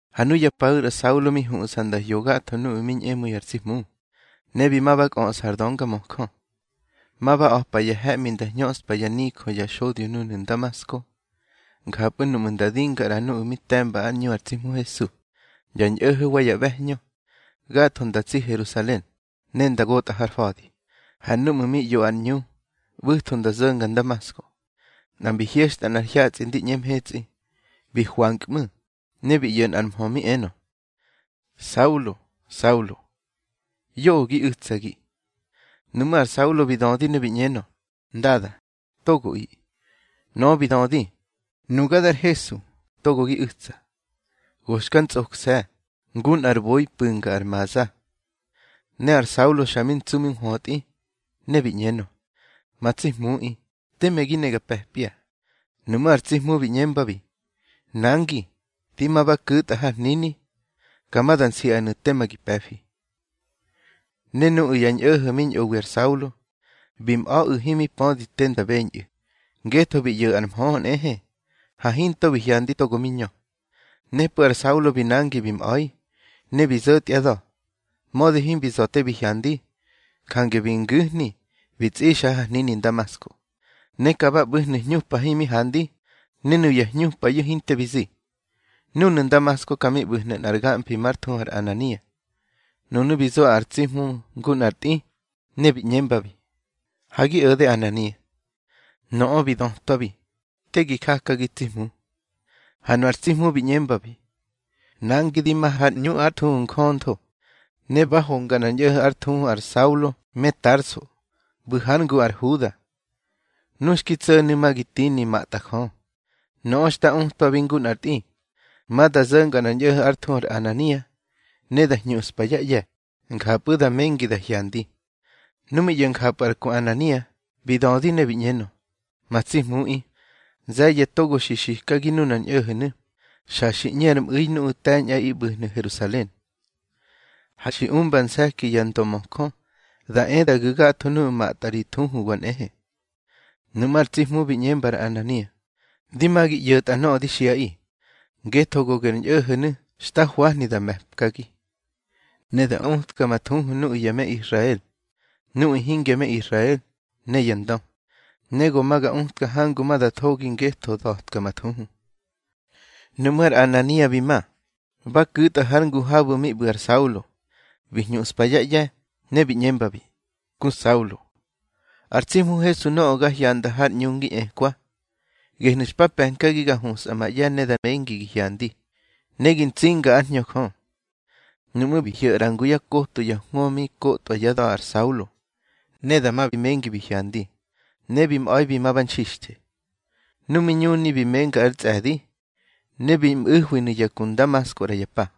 Ha nuya paꞌu̱ ar Saulo mi huꞌsa nda hyo gatho nuꞌu̱ mi ñꞌemu̱i ar tsi Hmu. Ne bi ma ba kꞌöꞌsa ar döngamöjö, ma ba a̱pa ya he̱ꞌmi nda hñöꞌspa yá nijö ya xodyo núnu̱ Ndamasko. Njapꞌu̱ núꞌmu̱ nda dinga ꞌra nuꞌu̱ mi te̱mba ár ꞌñu ar tsi Hmu Hesu, ya ñꞌo̱ho̱ wa ya ꞌbe̱hñö, gatho nda tsi Herusalen, ne nda gotꞌa har fa̱di. Ha núꞌmu̱ mi ꞌyo ar ꞌñu, ꞌbu̱tho nda zo̱nga Ndamasko, nꞌa mbi hyexta nꞌar hyatsꞌi ndi ꞌñe mhetsꞌi. Bi hwankꞌmu̱, ne bi ꞌyo̱ nꞌar mhö mi enö: —Saulo, Saulo, yoꞌö gi u̱tsagi. Nuꞌmú̱ ar Saulo bi dödi ne bi ꞌñenö: —Ndada, togoꞌi. Nöꞌö bi dödi: —Nuga dar Hesu, togo gi u̱tsa. Go xka ntsꞌokse̱, ngu nꞌar boi pu̱nga ar maza. Ne ar Saulo xa mi ntsu mi nhwötꞌi, ne bi ꞌñenö: —Ma tsi Hmuꞌi, teme gi ne ga pe̱pya. Nuꞌmú̱ ar tsi Hmu bi ꞌñembabi: —Nangi, di ma ba ku̱tꞌa har hnini, ka ma da nsiꞌanu̱ tema gi pe̱fi. Ne nuꞌu̱ ya ñꞌo̱ho̱ mi ñꞌowi ar Saulo, bi mꞌa̱ꞌu̱ himi pödi te nda beñꞌu̱, ngetho bi ꞌyo̱ꞌu̱ ar mhö nꞌehe, ha hinto bi hyandi togo mi ñö. Nepꞌu̱ ar Saulo bi nangi bi mꞌa̱i, ne bi zo̱tyá da̱, mödi himbi za̱ te bi hyandi. Jange bi ngu̱hni bi tsꞌixa har hnini Ndamasko. Ne ka ba ꞌbu̱hnu̱ hñupa himi handi. Ne nuya hñupayu̱ hinte bi zi. Núnu̱ Ndamasko ka mi ꞌbu̱hnu̱ nꞌar gamfi már thuhu ar Anania. Nunu̱ bi zo ar tsi Hmu ngu nꞌar tꞌi, ne bi ꞌñembabi: —Ha gi o̱de, Anania. Nöꞌö bi dötwabi: —Te gi jaki, tsi Hmu. Ha nu ar tsi Hmu bi ꞌñembabi: —Nangi di ma har ꞌñu ár thuhu Njöntho, ne ba honga nꞌar ñꞌo̱ho̱ ár thuhu ar Saulo me Tarso, ꞌbu̱ hár ngu ar Huda. Nu xki tso̱nu̱ ma gi tini matꞌa Jö. Nöꞌö xta utwabi ngu nꞌar tꞌi, ma da zo̱nga nꞌar ñꞌo̱ho̱ ár thuhu ar Anania, ne da hñuꞌspa yá ꞌye̱, njapꞌu̱ da mengi da hyandi. Nu mi ꞌyo̱ njapꞌu̱ ar ku Anania, bi dödi ne bi ꞌñenö: —Ma tsi Hmuꞌi, nze̱ye̱ togo xi xikagi nunar ñꞌo̱ho̱nu̱ xa xi ꞌñe ar mꞌu̱i nuꞌu̱ te̱ñꞌaꞌi ꞌbu̱hnu̱ Herusalen. Ha xi umba nse̱ki ya ndömöjö da e da gu̱ gatho nuꞌu̱ matꞌa ri thuhuwa nꞌehe. Nuꞌmú̱ ar tsi Hmu bi ꞌñemba ar Anania: —Di ma gi ꞌyo̱tꞌa nöꞌö di xiꞌaꞌi. Ngetho go ger ñꞌo̱ho̱nu̱ xta hwahni da me̱pkagi, ne da utka ma thuhu nuꞌu̱ ya me Israel, nuꞌu̱ hingya me Israel ne yá ndö. Ne go ma ga utka hangu ma da thogi ngetho da̱tka ma thuhu. Nuꞌmú̱ ar Anania bi ma, ba ku̱tꞌa har ngu habu̱ mi ꞌbu̱ ar Saulo, bi hñuꞌspa yá ꞌye̱, ne bi ꞌñembabi: —Ku Saulo, ar tsi Hmu Hesu nöꞌö ga hyanda har ꞌñu ngi ꞌñekwa, gehnu̱ xpa pe̱nkagi ga husꞌa ma ꞌye̱ ne da mengi gi hyandi, ne gi nzinga ár Hñö Jö. Nuꞌmú̱ bi hyo̱ ꞌra ngu yá koto ya hwö mi kotwa yá da̱ ar Saulo, ne dama bi mengi bi hyandi, ne bi mꞌa̱i bi ma ba nxixthe. Nu mi ñuni bi menga ár tsꞌe̱di, ne bi mꞌu̱hwinu̱ ya ku Ndamasko ꞌra ya pa.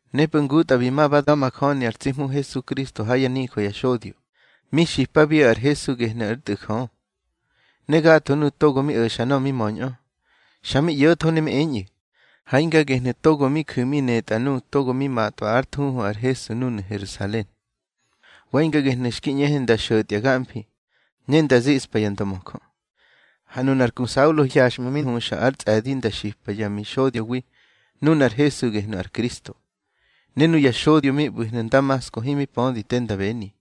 Nepꞌu̱ ngutꞌa bi ma ba da̱majöni ar tsi Hmu Hesukristo ha yá nijö ya xodyo, mi xipabiꞌu̱ ar Hesu gehnu̱ ár Tꞌu̱ Jö. Ne gatho nuꞌu̱ togo mi o̱xa nöꞌö mi möñꞌö, xa mi ꞌyo̱tho ne mi eñꞌu̱: —Ha hinga gehnu̱ togo mi ju̱ mi netꞌa nuꞌu̱ togo mi matꞌwa ár thuhu ar Hesu núnu̱ Herusalen. Wa hinga gehnu̱ xki ꞌñehe nda xo̱tya gamfi, ne nda ziꞌspa ya ndömöjö. Ha nunar ku Saulo hyaxꞌmu̱ mi huxa ár tsꞌe̱di nda xipa yá mixodyowi nunar Hesu gehnu̱ ar Kristo. Ne nuya xodyo mi ꞌbu̱hnu̱ Ndamasko himi pödi te nda beni.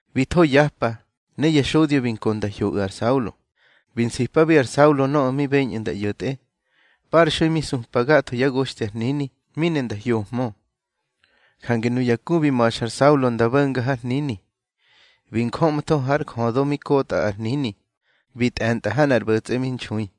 Bi tho yapa, ne ya xodyo bi nko nda hyoꞌu̱ ar Saulo. Bi nsipabi ar Saulo nöꞌö mi beñꞌu̱ nda ꞌyo̱tꞌe. Parxui mi supa gatho yá goxthi ar hnini, mi ne nda hyohmö. Jange nuya ku bi ma̱xa ar Saulo nda bo̱nga har hnini, bi njöꞌmtho har jödo mi kotꞌa ar hnini, bi tꞌe̱ntꞌa ha nꞌar ꞌbo̱tsꞌe mi nxui.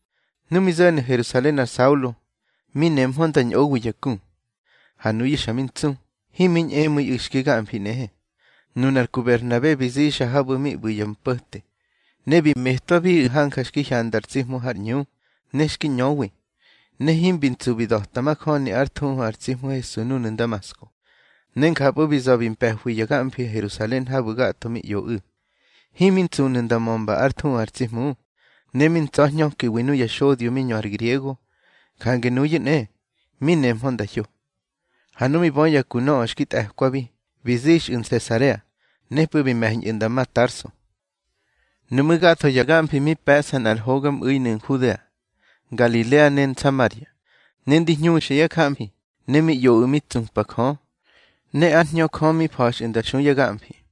Nu mi zo̱nu̱ Herusalen ar Saulo, mi nemhö nda ñꞌowi ya ku. Ha nuyu̱ xa mi ntsu, himi ñꞌemu̱iꞌu̱ xki gamfi nꞌehe. Nunar ku Berhnabe bi zixa habu̱ mi ꞌbu̱ ya mpo̱te, ne bi metwabiꞌu̱ hanja xki hyanda ar tsi Hmu har ꞌñu, ne xki ñöwi, ne himbi ntsu bi da̱ta majöni ár thuhu ar tsi Hmu Hesu núnu̱ Ndamasko. Ne njapꞌu̱ bi za̱ bi mpe̱hwi ya gamfinu̱ Herusalen habu̱ gatho mi ꞌyoꞌu̱. Himi ntsunu̱ nda mömba ár thuhu ar tsi Hmu, ne mi ntsa̱hñökiwi nuya xodyo mi ñö ar griego, jange nuyu̱ nꞌe, mi nehmö nda hyo. Ha nu mi bö ya ku nöꞌö xki tꞌe̱kwabi, bi zixꞌu̱ Nsesarea, nepꞌu̱ bi me̱ñꞌu̱ nda ma Tarso. Nuꞌmú̱ gatho ya gamfi mi pe̱ꞌsa nꞌar hogamꞌu̱inu̱ Nhudea, Ngalilea ne Nsamaria. Ne ndi hñuxa yá jamfi, ne mi ꞌyoꞌu̱ mi tsupa Jö, ne ár Hñö Jö mi fa̱xꞌu̱ nda xu ya gamfi.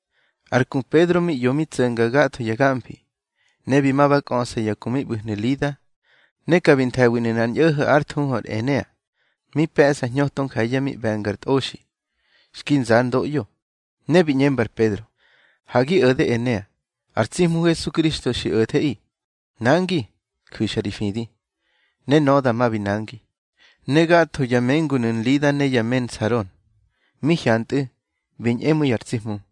Har ku Pedro mi ꞌyo mi tso̱nga gatho ya gamfi, ne bi ma ba kꞌöꞌsa ya ku mi ꞌbu̱hnu̱ Lida. Ne ka bi nthe̱winu̱ nꞌar ñꞌo̱ho̱ ár thuhu ar Enea, mi pe̱ꞌsa hñöto nje̱ye̱ mi ꞌbe̱ngar tꞌoxi, xki nza ár ndoꞌyo. Ne bi ꞌñemba ar Pedro: —Ha gi o̱de Enea, ar tsi Hmu Hesukristo xi o̱theꞌi. Nangi, ju̱xa ri fidi. Ne nöꞌö dama bi nangi. Ne gatho ya mengunu̱ Lida ne ya me Saron, mi hyantꞌu̱, bi ñꞌemu̱i ar tsi Hmu.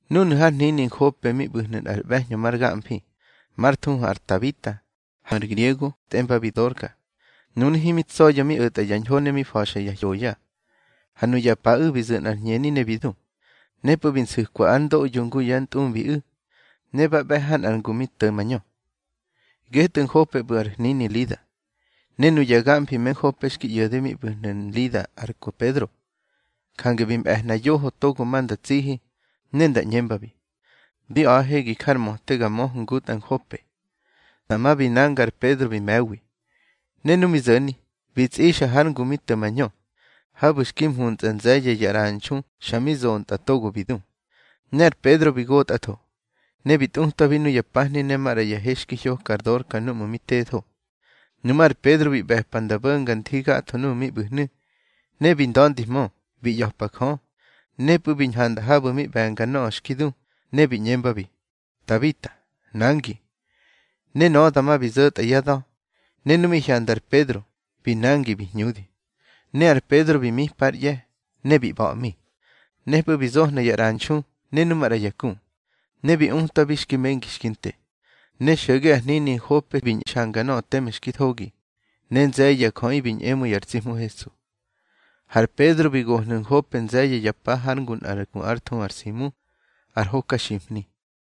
Núnu̱ har hnini Nhope mi ꞌbu̱hnu̱ nꞌar ꞌbe̱hñö mar gamfi, mar thuhu ar Tabita, har griego tꞌembabi Dorka. Nunu̱ himi tsa̱ya̱ mi o̱tꞌa ya ñho ne mi fa̱xa ya hyoya. Ha nuya paꞌu̱ bi zu̱ nꞌar hñeni ne bi du. Nepꞌu̱ bi nsu̱kwa ár ndoꞌyo ngu yá ntꞌumbiꞌu̱, ne ba ꞌbe̱ ha nꞌar ngu mi to̱ mañö. Getꞌu̱ Nhope ꞌbu̱ ar hnini Lida. Ne nuya gamfi me Nhope xki ꞌyo̱de mi ꞌbu̱hnu̱ Nlida ar ku Pedro. Jange bi mꞌe̱hna yoho togo ma nda tsihi, ne nda ꞌñembabi: —Di a̱ꞌahe gi jar möte ga möhö ngutꞌa Nhope. Dama bi nanga ar Pedro bi me̱wi. Ne nu mi zo̱ni, bi tsꞌixa har ngu mi to̱ mañö, habu̱ xki mhuntsꞌa nze̱ye̱ ya ꞌranxu xa mi zontꞌa togo bi du. Ne ar Pedro bi gotꞌatho, ne bi tꞌutwabi nuya pahni ne maꞌra ya he xki hyoka ar Dorka núꞌmu̱ mi tetho. Nuꞌmú̱ ar Pedro bi ꞌbe̱pa nda bo̱nga nthi gatho nuꞌu̱ mi ꞌbu̱hnu̱, ne bi nda̱ndihmö, bi ꞌya̱pa Jö. Nepꞌu̱ bi ñhanda habu̱ mi ꞌbe̱nga nöꞌö xki du, ne bi ꞌñembabi: —Tabita, nangi. Ne nöꞌö dama bi zo̱tꞌa yá da̱, ne nu mi hyanda ar Pedro, bi nangi bi hñudi. Ne ar Pedro bi mipa ár ꞌye̱, ne bi ꞌba̱ꞌmi. Nepꞌu̱ bi zohna ya ꞌranxu ne nu maꞌra ya ku, ne bi utwabi xki mengi xki nte. Ne xo̱ge har hnini Nhope bi nxanga nöꞌö teme xki thogi, ne nze̱ye̱ ya jöꞌi bi ñꞌemu̱i ar tsi Hmu Hesu. Har Pedro bi gohnu̱ Nhope nze̱ye̱ ya pa hár ngu nꞌar ku ár thuhu ar Simu, ar hokaximhni.